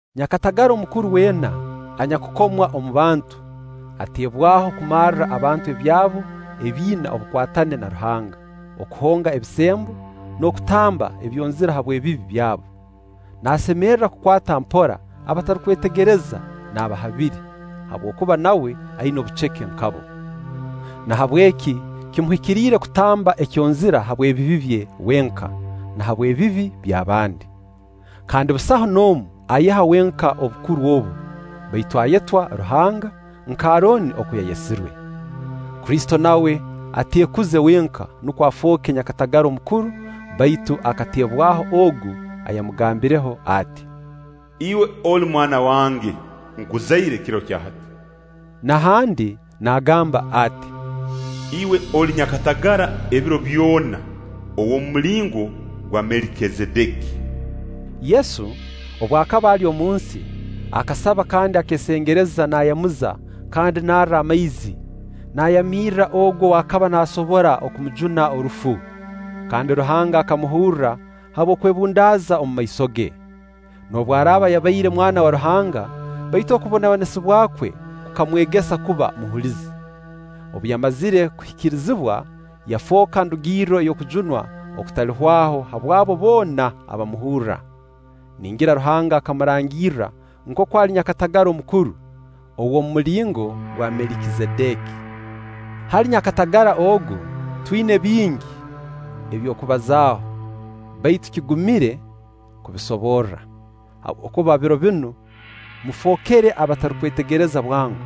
Nyakatagara omukuru weena anyakukomwa omu bantu, ateebwaho kumarra abantu ebyabo ebiina obukwatane na Ruhanga, okuhonga ebisembo, n'okutamba ebyonzira habw'ebibi byabo. Naasemerra kukwata mpora abatarukwetegereza n'abahabire, habwokuba nawe aina obuceke nk'abo. Nahabweki kimuhikiriire kutamba ekyonzira habw'ebibi bye wenka, na habw'ebibi by'abandi. Kandi busaho n'omu ayeha wenka obukuru obu, baitu ayetwa Ruhanga, nk'Arooni oku yayesirwe. Kristo nawe ateekuze wenka nukwo afooke nyakatagara omukuru baitu akateebwaho Ogu ayamugambireho ati: “Iwe oli mwana wange, nkuzaire kiro kya hati.” Na handi naagamba ati: “Iwe oli nyakatagara ebiro byona, ow'omu mulingo gwa Melikizedeki.” Yesu, obu akaba ali omunsi, akasaba kandi akeesengereza naayamuza kandi narra amaizi, nayamirra Ogu ow'akaba naasobora kumujuna orufu; kandi Ruhanga akamuhurra habw'okwebundaaza omumaiso ge. Noobu araaba yabaire Mwana wa Ruhanga, baitu okubonabonesibwa kwe kukamwegesa kuba muhulizi. Obu yamazire kuhikirizibwa, yafooka ndugirro ey'okujunwa okutalihwaho habw'abo boona abamuhurra; ningira Ruhanga akamurangirra nkooku ali nyakatagara omukuru, ow'omu mulingo gwa Melikizedeki. Hali nyakatagara ogu, twina bingi eby'okubazaaho, baitu kigumire kubisoborra, habwokuba biro binu mufookere abatarukwetegereza bwango.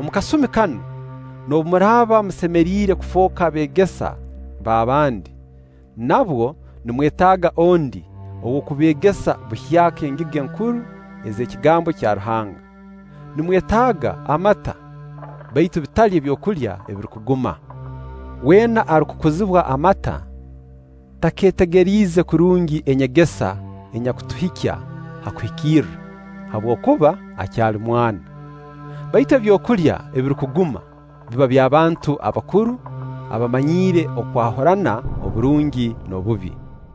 Omu kasumi kanu, noobu muraaba musemeriire kufooka beegesa b'abandi, nabwo nimwetaaga ondi ow'okubeegesa buhyaka engiga enkuru ez'ekigambo kya Ruhanga. Nimwetaaga amata, baitu bitali byokulya ebirukuguma. Weena arukukuzibwa amata, takeetegeriize kurungi enyegesa enyakutuhikya ha kuhikirra, habwokuba akyali mwana. Baitu ebyokulya ebirukuguma, biba by'abantu bakuru abamanyiire okwahurana oburungi n'obubi.